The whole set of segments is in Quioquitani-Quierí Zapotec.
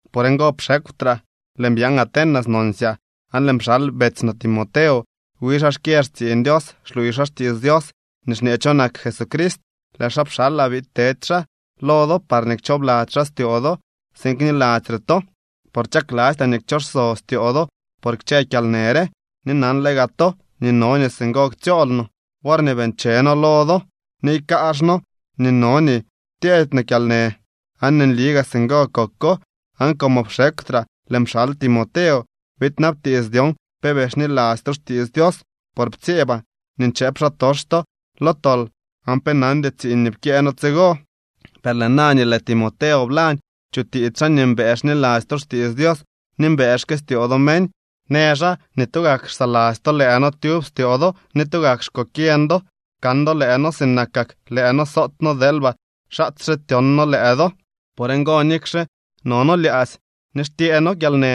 Por ngo pxekwtraa, lëën byaan Atenas nonsyaa, aan lëën pxal betsy no Timoteo. Wi xaa xkyë xtsiiñ Dios xluuy xaa xtiits Dios nii xñee cho nak Jesucrist. Lëë xaa pxalaa biid tedy xaa lo do parñee kchoobladzy xaa styoo do tsiin kniladzy re to. Por chaklastyaa nii kchoso styoo do por kchë kyalnë re, ni nanle gaa to nii no nii singo ktsyool no. Worñee bii ncheno noo lo do, niiy kaazh noo nii no nii tyeedy no kyalnë. Aan nli gaa singo koko. Aan como pxekwtraa lëën pxal Timoteo biidnabtiits dyon pe bii xniladzy to xtiits Dios. Por ptsyeebaa nii nchëëp xaatox to lo tol aan pe nandy tsiiñ nii pkyëë noo tsigo. Per lëë na nii lëë Timoteo blañ chutiits xaa nii mbëë xniladzy to xtiits Dios ni mbëë xkëstyoo do meñ. Në xaa nii tugak xsaladzy to lëë noo tyub styoo do ni tugak xkokyeñ do kan do lëë noo sinakak lëë noo soot noo deelba xaatsye tyon noo lëë do. Por ngo, nikxe nii no noo lyaadzy ni xtyee noo kyalnë,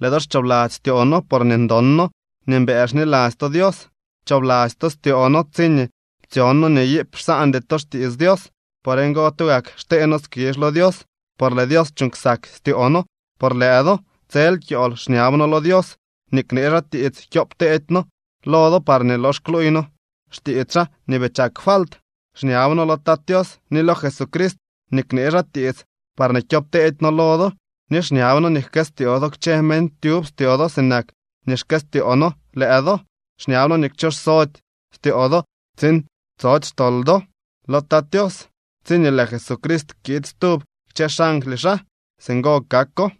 lëë do xchoobladzy styoo noo porñee ndon noo nii mbëë xniladzy to Dios. Pchoobladzy to styoo noo tsiñee ptsyon noo nii iip xsaandy to xtiits Dios. Por ngo, tugak xtee noo skizh lo Dios por lëë Dios chuuñ ksak styoo noo por lëë do. Tsel kyool xñab noo lo Dios nii knee xaa tiits kyoop teedy noo lo do parñee lox kluuy noo xtiits xaa nii bii chak falt. Xñab noo lo Tat Tios ni lo Jesucrist nii knee xaa tiits parñee kyoopteedy noo lo do. Ni xñab noo nii jkëstyoo do kchë meñ tyub styoo do sinak nii xkëstyoo noo lëë do. Xñab noo nii kchooxsody styoo do tsiin tsody xtol do lo Tat Tios tsiñee lëë Jesucrist kiid stub kchë xangly xaa. Singo kako.